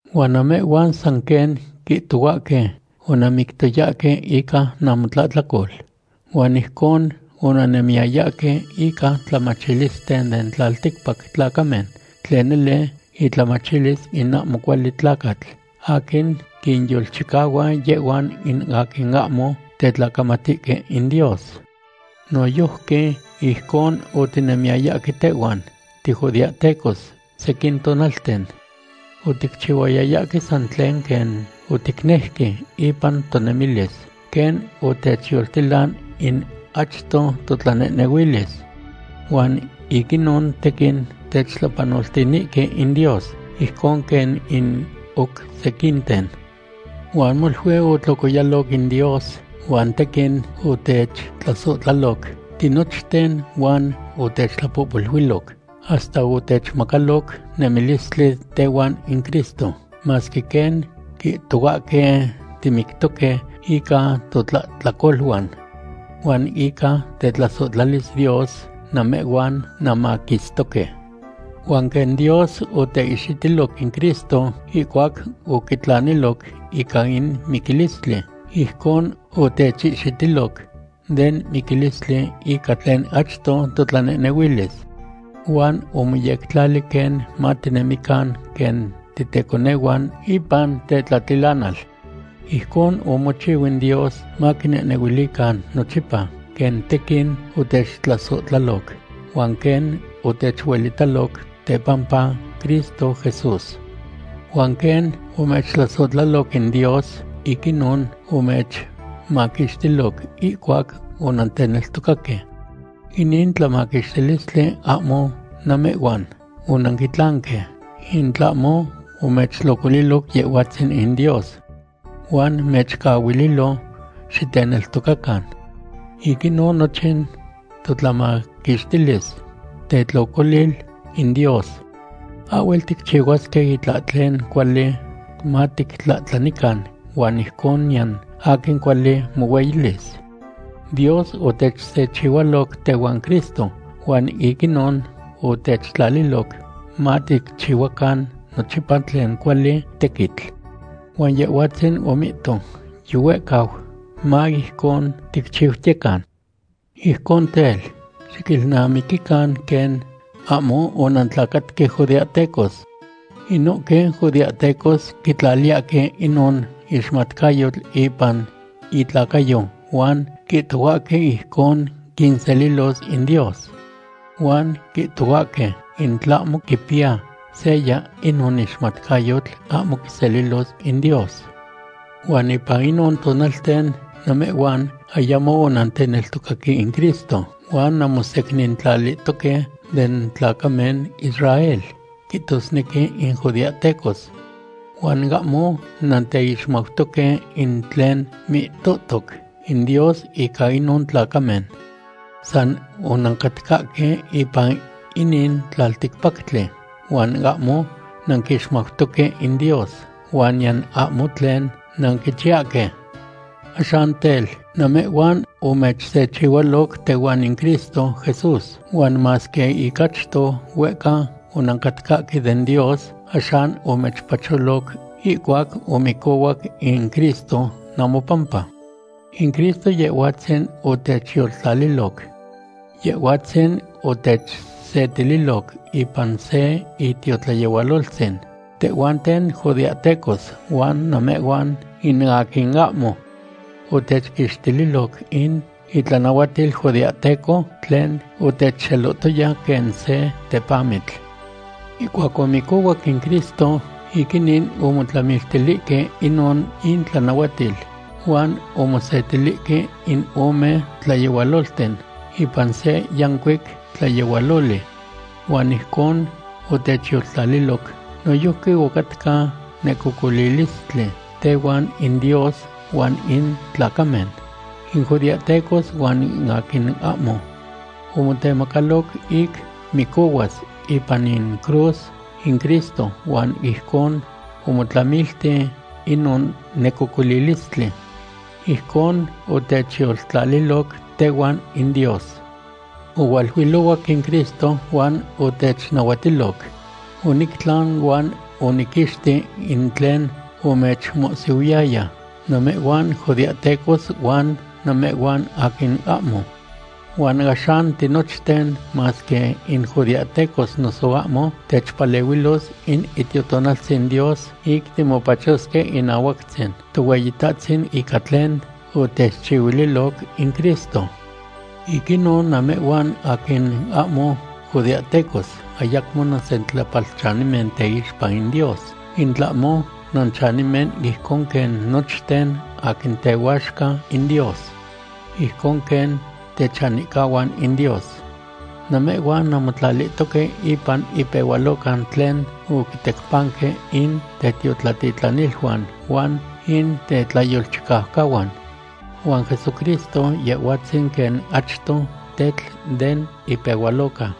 Huan namehhuan san quen quihtohuahque onanmictoyahque ica namotlahtlacol. Huan ijcon onannemiyayahque ica tlamachilisten den tlalticpac tlacamen tlen nele itlamachilis in ahmo cuali tlacatl aquin quinyolchicahua yehhuan in aquin ahmo tetlacamatihque in Dios. Noyojqui ijcon otinemiyayahque tehhuan tijudeahtecos sequin tonalten. Oticchihuayayahque san tlen quen oticnejque ipan tonemilis, quen otechyoltilan in achto totlanehnehuilis. Huan ic inon tequin techtlapanoltinihque in Dios, ijcon quen in oc sequinten. Huan molui otlocoyaloc in Dios huan tequin otechtlasohtlaloc tinochten huan otechtlapohpoluiloc, hasta otechmacaloc nemilistli tehuan in Cristo, masque quen quihtohuahque timictoque ica totlahtlacoluan. Huan ica tetlasohtlalis Dios namehhuan nanmaquistoque. Huan quen Dios oteihxitiloc in Cristo ihcuac oquitlaniloc ica in miquilistli, ijcon otechihxitiloc den miquilistli ica tlen achto totlanehnehuilis. Huan omoyectlali quen matinemican quen titeconehuan ipan tetlatilanal. Ijcon omochiu in Dios maquinehnehuilican nochipa quen tequin otechtlasohtlaloc huan quen otechuelitaloc tepampa Cristo Jesús. Huan quen omechtlasohtlaloc in Dios, ic inon omechmaquixtiloc ihcuac onanteneltocaque. Inin tlamaquixtilistli ahmo namehhuan onanquitlanque, in tlahmo omechtlocoliloc Yehhuatzin in Dios. Huan mechcahuililo xiteneltocacan. Ic inon nochin totlamaquixtilis tetlocolil in Dios. Ahhuel ticchihuasque itlahtlen cuali matictlahtlanican huan ijcon niyan aquin cuali mohueyilis. Dios otechsechihualoc tehuan Cristo, huan ic inon otechtlaliloc maticchihuacan nochipa tlen cuali tequitl. Huan Yehhuantzin omihto yihuehcau, ma ijcon ticchiutiyecan. Ijcon tel, xiquilnamiquican quen ahmo onantlacatque judeahtecos. Inohque judeahtecos quitlaliyahque inon ixmatcayotl ipan itlacayo huan quihtohuahque ijcon quinselilos in Dios. Huan quihtohuahque in tlahmo quipiya seya inon ixmatcayotl, ahmo quiselilos in Dios. Huan ipan inon tonalten namehhuan ayamo onanteneltocaque in Cristo, huan nanmosecnintlalihtoque den tlacamen Israel, quihtosnequi in judeahtecos. Huan ahmo nanteixmautoque in tlen mihtohtoc in Dios ica inon tlacamen. San onancatcahque ipan inin tlalticpactli huan ahmo nanquixmautoque in Dios huan niyan ahmo tlen nanquichiyahque. Axan tel, namehhuan omechsechihualoc tehuan in Cristo Jesús, huan masque ic achto huehca onancatcahque den Dios, axan omechpacholoc ihcuac omicohuac in Cristo namopampa. In Cristo Yehhuatzin otechyoltlaliloc. Yehhuatzin otechsetililoc ipan se itiotlayehualoltzin, tehhuanten judeahtecos huan namehhuan in aquin ahmo. Otechquixtililoc in itlanahuatil judeahteco tlen otechxelohtoya quen se tepamitl. Ihcuac omicohuac in Cristo, ic inin omotlamiltilihque inon intlanahuatil huan omosetilihque in ome tlayehualolten ipan se yancuic tlayehualoli. Huan ijcon otechyoltlaliloc. Noyojqui ocatca necocolilistli tehuan in Dios huan in tlacamen, in judeahtecos huan in aquin ahmo. Omotemacaloc ic micohuas ipan in cruz in Cristo huan ijcon omotlamilti inon necocolilistli. Ijcon otechyoltlaliloc tehuan in Dios. Ohualuilohuac in Cristo huan otechnahuatiloc: “Onictlan huan oniquixti in tlen omechmohsihuiyaya, namehhuan judeahtecos huan namehhuan aquin ahmo.” Huan axan tinochten, masque in judeahtecos noso ahmo, techpalehuilos in Itiotonaltzin Dios ic timopachosque inahuactzin Tohueyitahtzin ica tlen otechchihuililoc in Cristo. Ic inon, namehhuan aquin ahmo judeahtecos ayacmo nansentlapalchanimen teixpa in Dios, in tlahmo nanchanimen ijcon quen nochten aquin tehuaxca in Dios. Ijcon quen techanihcahuan in Dios. Namehhuan nanmotlalihtoque ipan ipehualoca tlen oquitecpanque in tetiotlatitlaniluan huan in tetlayolchicaucahuan. Huan Jesucristo, Yehhuatzin quen achto tetl den ipehualoca.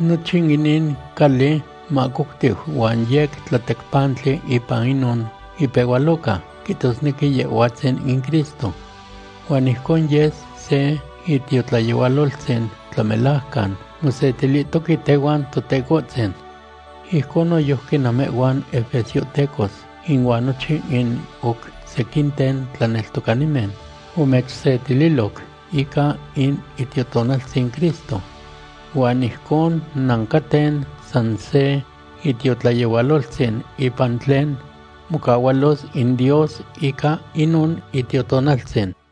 Nochin inin cali mahcoctiu huan yec tlatecpantli ipan inon ipehualoca, quihtosnequi Yehhuatzin in Cristo. Huan ijcon yes se itiotlayehualoltzin tlamelajcan mosetilihtoque tehuan Totecohtzin. Ijcon noyojqui namehhuan efesiohtecos inuan nochin in oc sequinten tlaneltocanimen omechsetililoc ica in Itiotonaltzin Cristo. Huan ijcon nancaten san se itiotlayehualoltzin ipan tlen mocahualos in Dios ica inon Itiotonaltzin.